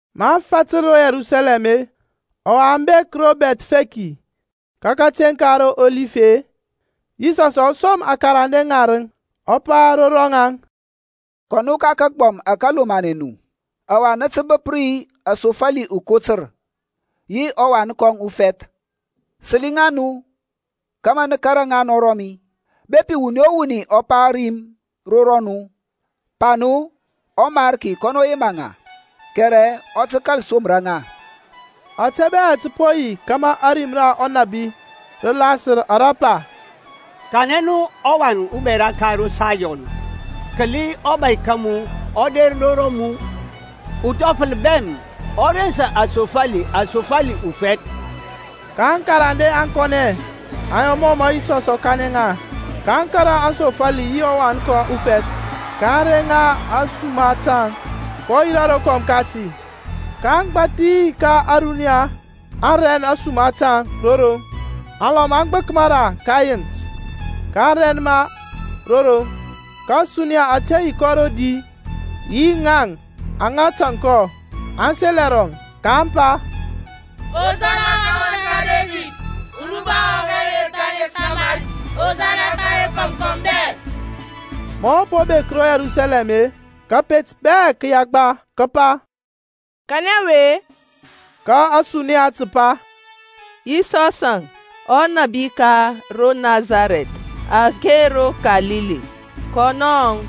Maŋ fatǝr ro Yerusalɛm-e, ɔwa aŋ bek ro Bɛthfeki ka kateŋ ka Ɔlif-e, Yisɔsȧŋ ɔ som aŋkarande ŋarǝŋ, ɔ pa ro rɔŋaŋ, Kɔ nu ka kagbɔm ȧke lomanɛ nu, ɔwa nǝ tǝ bǝp ri asofali ukotǝr, yi ɔwan kɔŋ ufɛth. Sǝli ŋa nu kȧmȧ nǝ kȧrȧ ŋa ro mi. Bepi wuni o wuni ɔ pa rim ro rɔnu, pa nu, ƆMariki kɔnɔ yema ŋa, kɛrɛ ɔ tǝ kȧl somra ŋa. Ȧte bɛ tǝ po yi kȧmȧ ȧrim ra ɔnȧbi rǝ lasǝr ara pa, Kanɛ nu ɔwan ubɛra ka ro Sayɔn, Kǝli ɔbȧy ka mu ɔ der ro rɔmu, Uthɔfǝl bɛm, ɔ rensa asofali, Asofali ufɛth. Ka aŋkarande aŋ kɔnɛ, aŋ yɔ mɔ mǝ Yisɔs ɔ kanɛ ŋa, kaŋ kȧrȧ aŋsofali yi ɔwan kɔŋ ufɛth, kaŋ reŋ ŋa ȧsuma taŋ, kɔ yirȧ rokɔm kati, Ka agbȧthi ka ȧruniya aŋ rɛn ȧsuma taŋ ro roŋ. Alɔm aŋ gbǝk mara ka ɛyint-e, kaŋ rɛn ma ro roŋ. Ka ȧsuniya ȧte yi kɔ rodi yi ŋaŋ aŋa tȧŋ kɔ, aŋ sel ɛrɔŋ, kaŋ pa, Hosana ka ɔwan ka Debid. Uruba wɔŋ ɔwe der ka ȧŋes ŋa ɔMarki, Hosana ka rokɔm kɔm bɛ! Ma ɔ po bek ro Yerusalɛm-e, kȧpet bɛ kǝ yagba, kǝ pa, Kanɛ ɔwe-e? Ka ȧsuniya tǝ pa, Yisɔsȧŋ, ɔnȧbi ka ro Nasarɛth ake ro Kalili, kɔnɔȧŋ.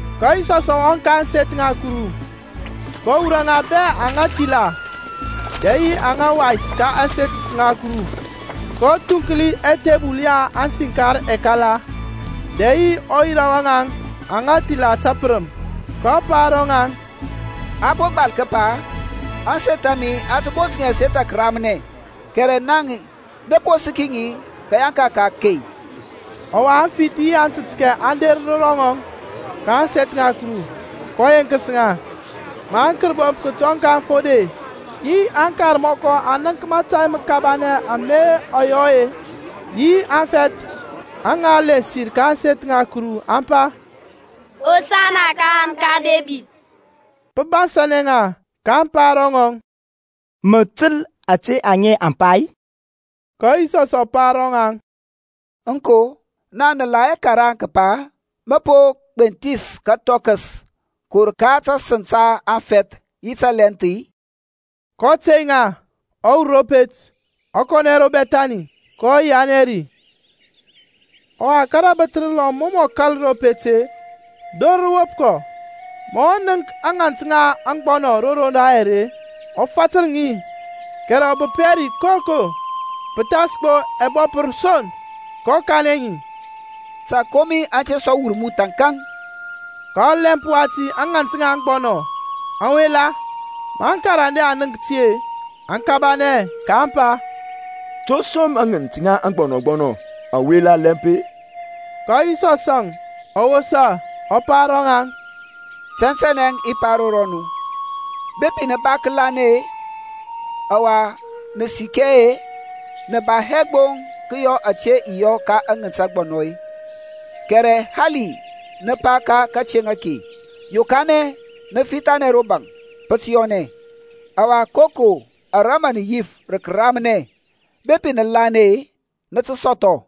Ka Yisɔsȧŋ ɔ wɔŋ ka ȧŋseth ŋa Kuru, kɔ wurɔ ŋa bɛ aŋa thila dɛ yi aŋa wais ka ȧŋseth ŋa Kuru, kɔ thuŋkli ɛthebul ya aŋsinkar ɛkala, dɛ yi ɔyira wa ŋaŋ aŋa thila tǝpǝrǝm. kɔ pa ro ŋaŋ, A po gbal kǝpa, Ȧŋseth a mi a tǝ bont ŋi ȧseth ŋa kǝramnɛ, kɛrɛ naŋ-e, nǝ po sǝki ŋi kǝyanka ka akey. Ɔwa aŋfith yi antǝtkɛ aŋ der ro ŋɔŋ ka ȧŋseth ŋa Kuru, kɔ yeŋkǝs ŋa. Ma aŋkərbomp kǝtɔŋ ka aŋfode yi aŋkarmɔkɔ aŋ nənk mȧtȧy mǝkabanɛ ama ɔ yɔ-e, yi aŋfɛth aŋa lensir ka ȧŋseth ŋa Kuru, aŋ pa, Hosana ka ɔwan ka Debid; pǝ bansȧnɛ ŋa, kaŋ pa ro ŋɔŋ, Mǝ tǝl ȧte aŋe aŋ pa-i? Ka Yisɔsȧŋ ɔ pa ro ŋaŋ, Aŋko; naŋ nǝ la hɛ karaŋ kǝpa, Mǝ po gbenthis kǝthɔkǝs kǝwur ka tasǝŋ ta afɛth yi tǝlɛnth-i? kɔ tey ŋa, ɔ wur ro pet ɔ kɔnɛ ro Bɛthani, kɔ yianɛ ri. Ɔwa ka rǝbǝth rǝlɔm mɔ mǝ ɔ kȧl ro pet-e, dor rǝ wop kɔ. Ma ɔ nənk ŋǝnt ŋa aŋgbɔnɔ ro roŋ dayɛr-e, ɔ fatǝr ŋi, kɛrɛ ɔ bǝp hɛ ri koko pǝthas gbo ɛbɔpǝr son, kɔ kanɛ ŋi, Ta akomi aŋ te sɔ wur mu thȧnkȧŋ. Ka ɔlɛmp wati aŋǝnt ŋa aŋgbɔnɔ aŋ wela. Ma aŋkarande aŋ nənk ti-e, aŋ kabanɛ, kaŋ pa, To som aŋǝnt ŋa aŋgbɔnɔ aŋ wela lɛmp-e? Ka Yisɔsȧŋ ɔ wosa, ɔ pa ro ŋaŋ, Tɛntɛnɛ i pa ro nu, Bepi nǝ ba kǝlanɛ-e, ɔwa nǝ sikɛ hɛ-e, nǝ ba hɛ gbo kǝyɔ ȧte i yɔ aŋǝnt ŋa aŋgbɔnɔ-e, kɛrɛ hali nǝ pa ka kateŋ ake, Yokanɛ mǝ fithanɛ ro baŋ, pǝ tǝ yɔnɛ. Ɔwa koko ara mǝ nǝ yif rǝ kǝramnɛ, bepi nǝ lanɛ-e, nǝ tǝ sɔthɔ.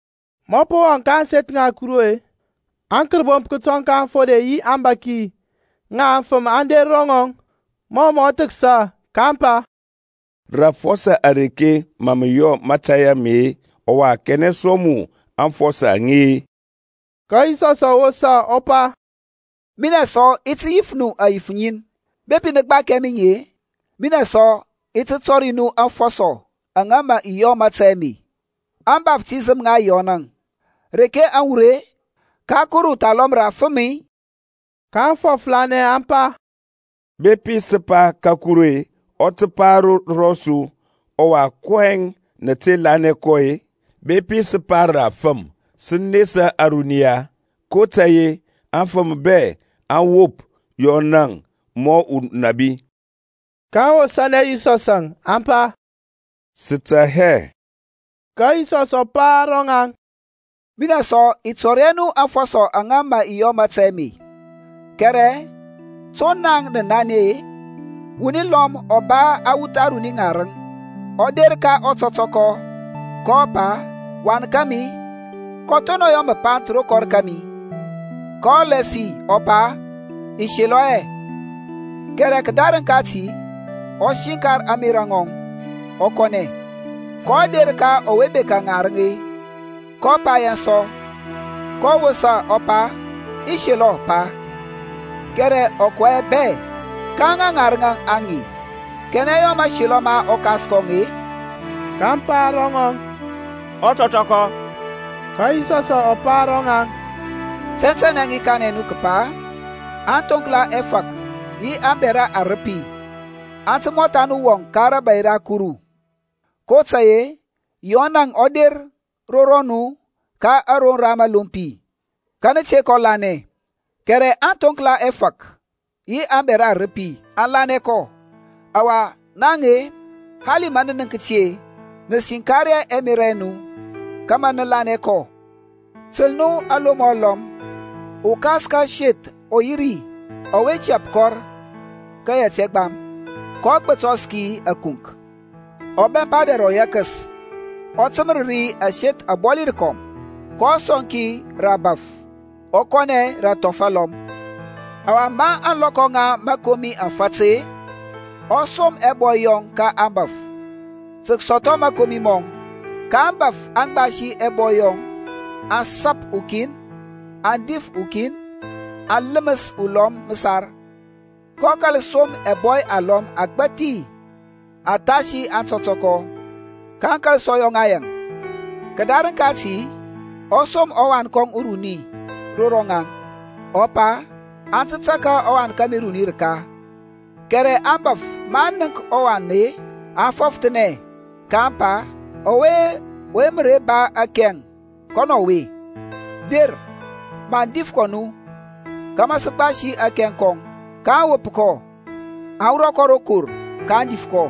Ma ɔ po wɔŋ ka ȧŋseth ŋa Kuru-e, aŋkərbomp kǝtɔŋ ka aŋfode yi aŋbȧki ŋa aŋfǝm aŋ der ro ŋɔŋ mɔ mǝ ɔ thǝksa, kaŋ pa, Rǝ afɔsɔ areke mǝ mǝ yɔ mȧtȧy ame-e, ɔwa kanɛ sɔŋ mu aŋfɔsɔ aŋe-ȧ? Ka Yisɔsȧŋ ɔ wosa ɔ pa, Minɛ sɔ i ti yif nu ȧyif ŋin. Bepi nǝ gbakia mi ŋi-e, minɛ sɔ i ti tɔri nu aŋfɔsɔ aŋa mǝ i yɔ mȧtȧy ame. Ȧŋbaftisəm ŋa Yɔn-e, reke aŋ wur-e? Ka Kuru thalɔm rǝ afǝm-i? kaŋ fɔfǝranɛ aŋ pa, Bepi sǝ pa, Ka Kuru-e, ɔ tǝ pa ro rɔsu, Ɔwa kɔyɛŋ nǝ te lanɛ kɔ-e? Bepi sǝ pa, Rǝ afǝm, sǝ nesa ȧruniya, kotȧy-e afǝm bɛ aŋ wop Yɔnȧŋ mɔ unabi. kaŋ wosȧnɛ Yisɔsȧŋ, aŋ pa, Sǝ tɛ hɛ. Ka Yisɔs ɔ pa ro ŋaŋ, Minɛ sɔ i tɔri hɛ nu aŋfɔsɔ aŋa mǝ i yɔ mȧtȧy ame. Kɛrɛ to naŋ nǝ nanɛ-e? Wuni lɔm ɔ ba awuth aruni ŋarǝŋ. Ɔ der ka ɔtɔtɔkɔ, kɔ pa, Wan kȧmi, kɔ thonɔŋ yɔ mǝpanth ro kɔr kȧmi. kɔ lasi ɔ pa, I selɔ hɛ; kɛrɛ kǝdarǝŋ kati ɔ siŋkar ȧŋmerȧ ŋɔŋ, ɔ kɔnɛ. kɔ der ka ɔwe bekȧ ŋarǝŋ-e, kɔ pa yaŋ sɔ, kɔ wosa ɔ pa, I selɔ Pa; kɛrɛ ɔ kɔ hɛ bɛ. Ka ŋa ŋarǝŋ aŋe-e, kanɛ yɔ mȧselɔ ma ɔkas kɔŋ-e? kaŋ pa ro ŋɔŋ, Ɔtɔtɔkɔ. Ka Yisɔsȧŋ ɔ pa ro ŋaŋ, Tɛntɛnɛ i kanɛ nu kǝpa aŋthoŋkla ɛfȧk yi aŋbɛra arǝpi aŋ tǝ mɔtha nu wɔŋ ka rȧbȧy ra Kuru. kotȧy-e Yɔnȧŋ ɔ der ro nu ka aroŋ da mǝlompi, ka nǝ te kɔ lanɛ; kɛrɛ aŋthoŋkla ɛfȧk yi aŋbɛra arǝpi aŋ lanɛ kɔ. Ɔwa naŋ-e, hali ma nǝ nənk ti-e, nǝ siŋkar hɛ ɛmerȧ ɛ nu kȧmȧ nǝ lanɛ kɔ. Tǝl nu alomɔ alɔm. Ukas ka aseth ɔ yi ri ɔwe tɛp kɔr ka yɛt ɛgbam, kɔ gbǝtɔr ki ȧkunk-e, ɔ bɛmpa dɛr ɔyɛkǝs, ɔ tǝmǝr ri aseth abɔli rǝkɔm, kɔ sɔŋ ki rǝ ȧbȧf, ɔ kɔnɛ rǝ athɔf alɔm. Ɔwa ma ȧŋlɔkɔ ŋa mȧkomi aŋ fat-e, ɔ som ɛbɔy yɔŋ ka aŋbȧf tǝ kǝsɔthɔ mȧkomi mɔŋ. Ka aŋbȧf aŋ gbasi ɛbɔy yɔŋ aŋ sap ukin, aŋ dif ukin, aŋ lǝmǝs ulɔm mǝsar. kɔ kȧl som ɛbɔy alɔm agbȧthi athasi aŋtɔtɔkɔ. Kaŋ kȧl sɔ yɔ ŋa yaŋ. Kǝdarǝŋ kati ɔ som ɔwan kɔŋ uruni ro ŋaŋ, ɔ pa, Aŋ tǝ tȧrȧ ɔwan kȧmi uruni rǝka. Kɛrɛ aŋbȧf maŋ nənk ɔwan-e, aŋ fɔfǝranɛ, kaŋ pa, Ɔwe mǝ re ba akɛŋ, kɔnɔ ɔwe. Der, maŋ dif kɔ nu kȧmȧ sǝ gbasi akɛŋ kɔŋ. kaŋ wop kɔ, aŋ wurɔ kɔ ro kɔr, kaŋ dif kɔ.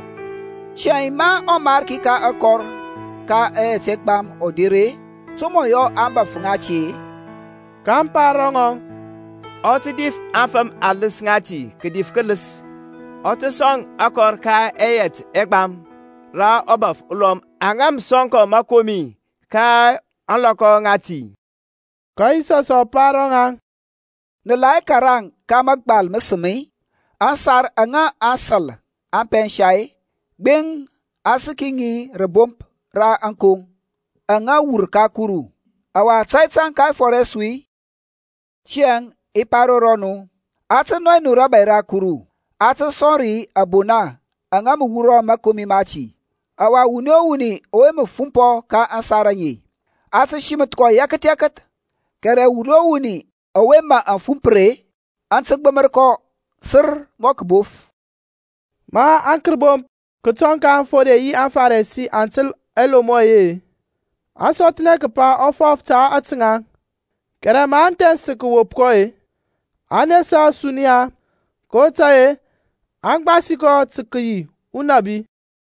Tiyȧŋ ma ɔmarki ka akɔr ka ɛyɛt ɛgbam ɔ der-e, to mǝ ɔ yɔ aŋbȧf ŋati-e? kaŋ pa ro ŋɔŋ, Ɔ tǝ dif aŋfǝm alǝs ŋati kǝdif kǝlǝs, ɔ tǝ sɔŋ akɔr ka ɛyɛt ɛgbam rǝ ȧbȧf alɔm aŋa mǝ sɔŋ kɔ mȧkomi ka ȧŋlɔkɔ ŋati. Ka Yisɔsȧŋ ɔ pa ro ŋaŋ, Nǝ la hɛ karaŋ ka mȧgbal mǝsǝm, Aŋsar aŋa aŋsȧl aŋ pɛnsa-e, gbeŋ, a sǝki ŋi rȧbomp ra ȧŋkoŋ. Aŋe aŋ wur ka Kuru, Ɔwa tȧy tȧŋ ka ɛfɔr ɛ su-i? Tiyȧŋ i pa ro rɔnu, A tǝ nɔy nu rȧbȧy ra Kuru, a tǝ sɔŋ ri abona aŋa mǝ wurɔ mȧkomi mati. Ɔwa wuni o wuni ɔwe mǝ fumpɔ ka aŋsar aŋe a tǝ simǝth kɔ yɛkǝth yɛkǝth. Kɛrɛ wuni o wuni ɔwe mǝ aŋ fumpǝr-e, aŋ tǝ gbǝm kɔ sir mɔ kǝbof. Ma aŋkərbomp kǝtɔŋ ka aŋfode yi aŋFarisi aŋ tǝl ɛlomɔ yɔŋ-e, aŋ sɔthnɛ kǝpa ɔ fɔf ta ȧte ŋaŋ. Kɛrɛ maŋ thɛns tǝ kǝwop kɔ-e, aŋ nesa ȧsuniya, kotȧy-e aŋ gbasi kɔ tǝ kǝyi unabi.